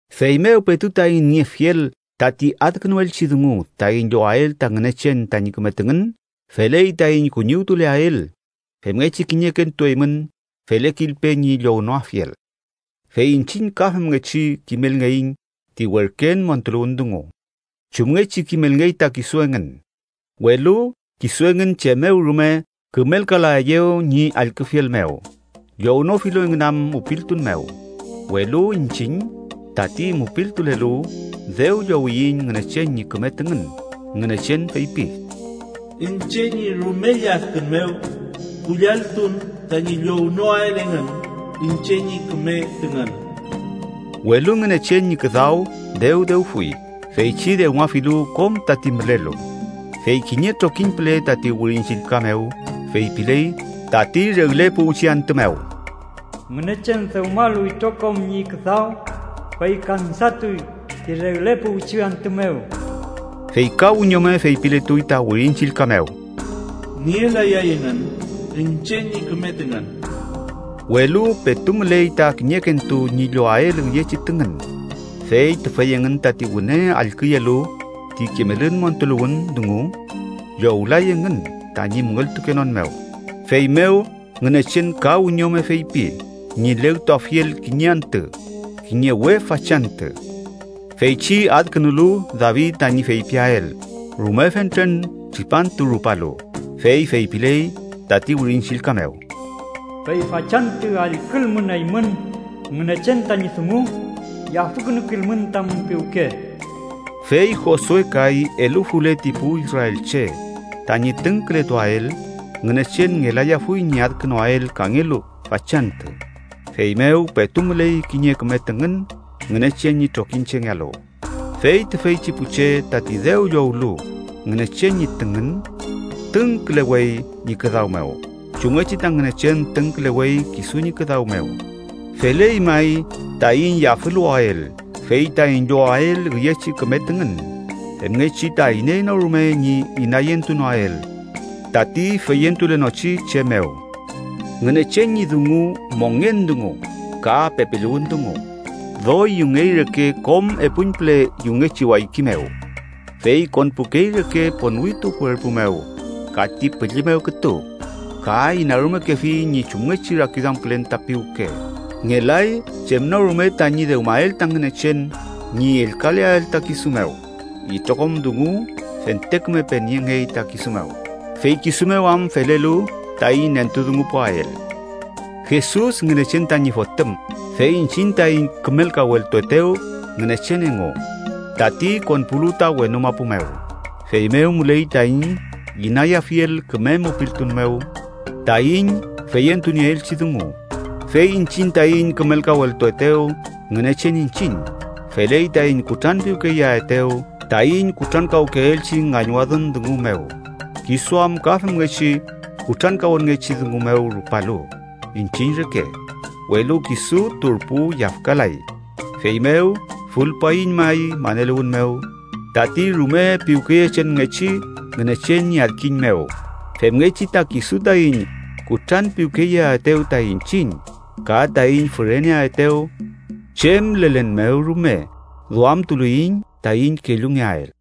Feymew, petu taiñ niefel tati adkünuelchi dungu taiñ llowael ta Ngünechen tañi küme tüngün, feley taiñ kuñiwtuleael femngechi kiñekentu eymün felekilpe ñi llownoafiel. Fey iñchiñ ka femngechi kimelngeiñ ti werken montuluwün dungu, chumngechi kimelngey ta kisu engün, welu kisu engün chem mew rume kümelkalaeyew ñi allküfiel mew, llownofilu engün am mupiltun mew. Welu iñchiñ, tati mupiltulelu, dew llowiyiñ Ngünechen ñi küme tüngün. Ngünechen feypi: “Iñche ñi rume lladkün mew, kuyalltun tañi llownoael engün iñche ñi küme tüngün.” Welu Ngünechen ñi küdaw dew dewfuy, feychi dewmafilu kom tati mülelu. Fey kiñe trokiñ püle tati Wirin Chillka mew feypiley tati regle puwchi antü mew: “Ngünechen dewmalu itrokom ñi küdaw, fey kansatuy ti regle puwchi antü mew.” Fey ka wiñome feypiletuy ta Wirin Chillka mew: “Nielayay engün iñche ñi küme tüngün.” Welu petu müley ta kiñekentu ñi llowael üyechi tüngün, fey tüfey engün tati wüne allküyelu ti kimelün montuluwün dungu llowlay engün tañi müngeltukenon mew. Feymew Ngünechen ka wiñome feypi ñi legtuafiel kiñe antü, kiñe we “fachantü” feychi adkünulu David tañi feypiael, rume fentren tripantu rupalu, fey feypiley tati Wirin Chillka mew: “Fey fachantü allkülmün eymün Ngünechen tañi dungu, yafükünukilmün tamün piwke.” Fey Josue kay elufule ti pu israelche tañi tüngkületuael, Ngünechen ngelayafuy ñi adkünuael kangelu “fachantü”. Feymew petu müley kiñe küme tüngün Ngünechen ñi trokiñchengealu: fey tüfeychi pu che tati dew llowlu Ngünechen ñi tüngün, tüngkülewey ñi küdaw mew, chumngechi ta Ngünechen tüngkülewey kisu ñi küdaw mew. Feley may taiñ yafüluwael fey taiñ llowael üyechi küme tüngün, femngechi ta iney no rume ñi inayentunoael tati feyentulenochi che mew. Ngünechen ñi dungu mongen dungu ka pepiluwün dungu. Doy yungey reke kom epuñpüle yungechi wayki mew, fey konpukey reke ponwitu kuerpu mew ka ti püllü mew kütu, ka inarumekefi ñi chumngechi rakiduamkülen ta piwke. Ngelay chem no rume tañi dewmael ta Ngünechen ñi ellkaleael ta kisu mew. Itrokom dungu fente küme peniengey ta kisu mew, fey kisu mew am felelu taiñ nentudungupuael. Jesus, Ngünechen tañi Fotüm, fey iñchiñ taiñ kümelkaweltuetew Ngünechen engu, tati konpulu ta wenu mapu mew. Feymew müley taiñ inayafiel küme mupiltun mew taiñ feyentunieelchi dungu. Fey iñchiñ taiñ kümelkaweltuetew Ngünechen iñchiñ feley taiñ kutranpiwkeyeaetew taiñ kutrankawkeelchi ngañwadün dungu mew, kisu am ka femngechi kutrankawünngechi dungu mew rupalu iñchiñ reke, welu kisu turpu yafkalay. Feymew fülpuaiñ may maneluwün mew tati rume piwkeyechenngechi Ngünechen ñi adkiñ mew, femngechi ta kisu taiñ kutranpiwkeyeaetew ta iñchiñ ka taiñ füreneaetew chem lelen mew rume duamtuliyiñ taiñ kellungeael.